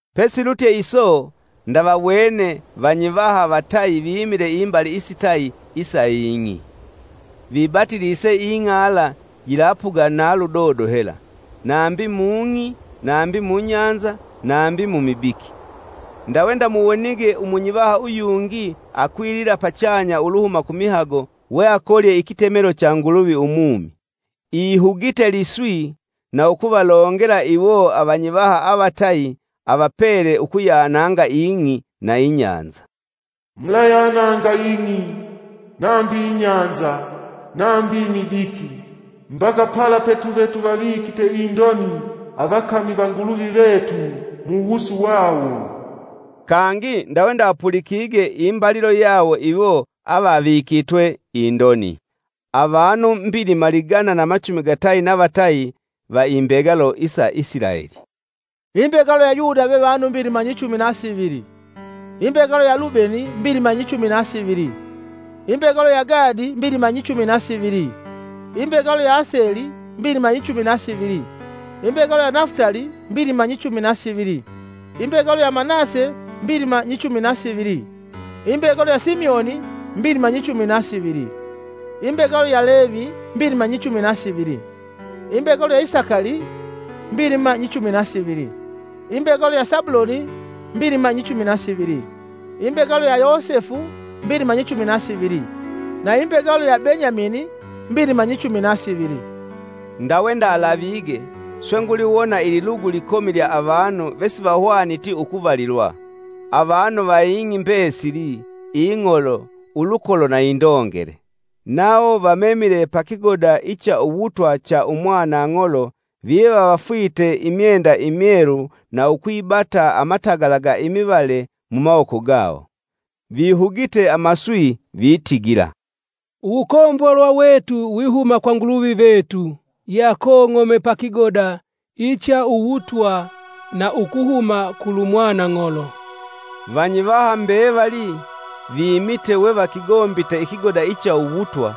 Pesilutye iso ndavawene vanyivaha vatayi vimile imbali isitayi isa ing'i, vibatilise ing'ala yilapuga na ludodo hela: nambi mung'i, nambi mubahali, nambi mumibiki. ndawe ndamuwonige umunyivaha uyungi akwilila pachanya uluhuma kumihago weakolye ikitemelo cha Nguluvi umumi. Ihugite liswi na ukuvalongela iwo avanyivaha avatayi avapele ukuyananga ing'i na ibahali, “Mulayananga ing'i, nambi ibahali, nambi imibiki, mbaka pala petuve tuvavikite indoni avakami va Nguluvi vetu mu wusu wawo.” Kangi ndawe ndapulikige imbalilo yawo iwo avikitwe indoni: Avanu mbilima ligana na machumi gatayi na vatayi va imbegalo isa Isilaeli. Imbegalo ya Yuda ve vanu mbilima nyichumi na sivili; imbegalo ya Lubeni, mbilima nyichumi na sivili, imbegalo ya Gadi mbilima nyichumi na sivili, imbegalo ya Aseli, mbilima nyichumi na sivili, imbegalo ya Nafutali, mbilima nyichumi na sivili, imbegalo ya Manase, mbilima nyichumi na sivili, imbegalo ya Simioni, mbilima nyichumi na sivili; imbegalo ya Levi, mbilima nyichumi na sivili, imbegalo ya Isakali, mbilima nyichumi na sivili; imbegalo ya Sabuloni, mbilima nyichumi na sivili, imbegalo ya Yosefu, mbilima nyichumi na sivili; na imbegalo ya Benyamini, mbilima nyichumi na sivili. Ndawe ndalavige, swe nguliwona ililugu ikomi lya avanu vesivahwaniti ukuvalilwa: avanu va ing'i mbesili, ing'olo, ulukolo na indongele. Nawo vamemile pa kigoda icha uwutwa cha umwanang'olo, viva vafwite imyenda imyelu na ukwibata amatagala ga imivale mumawoko gawo. Vihugite amaswi vitigila, “Uwukombolwa wetu wihuma kwa Nguluvi vetu yeakong'ome pa kigoda icha uwutwa, na ukuhuma kulu Mwanang'olo!” Vanyivaha mbevali viimite wevakigombite ikigoda cha uwutwa,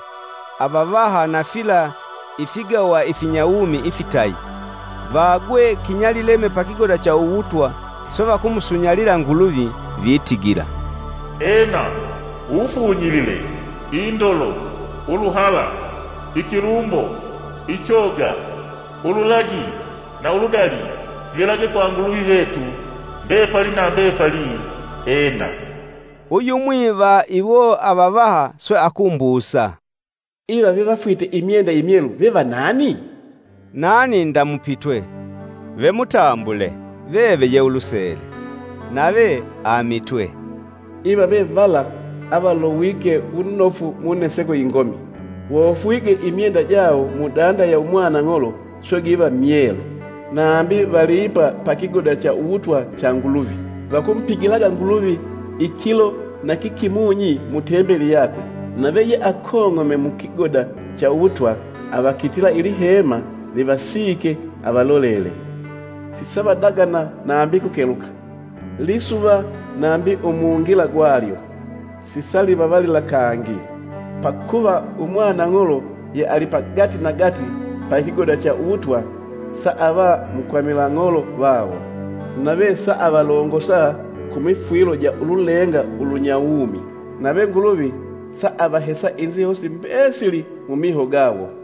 avavaha na fila ifigawa ifinyawumi ifitayi. Vaagwe kinyalileme pakigoda cha uwutwa, swe vakumusunyalila Nguluvi, Vitigila, “Ena! Uwufunyilile, indolo, uluhala, ikilumbo, ichoga, ululagi na uludali fivelage kwa Nguluvi vetu, mbepali na mbepali! Ena!” Uyumwi va iwo avavaha swe akumbusa, “Iva vevafwite imyenda imyelu veva nani?” Nani ndamupitwe! “Ve mutambule, veve ye ulusele!” Nave amitwe, “Iva ve vala avalowike wunofu muneseko ingomi. Wofwige imyenda jawo mudanda ya Umwanang'olo, swe giva myelu. Nambi vali ipa pa kigoda cha uwutwa cha Nguluvi. Vakumupigilaga Nguluvi ikilo na kikimunyi mu Tembeli yakwe; nave yeakong'ome mukigoda cha uwutwa avakitila ilihema livasiike avalolele. Sisavadagana nambi kukeluka; lisuva nambi umungila gwalyo, sisalivavalila kangi, pakuva umwanang'olo ye ali pagatinagati pa kigoda cha uwutwa saava mukwamila ng'olo vawo, nave saavalongosa ku mifwilo ja ululenga ulunyawumi. Nave Nguluvi saavahesa inzihosi mbesili mumiho gawo.”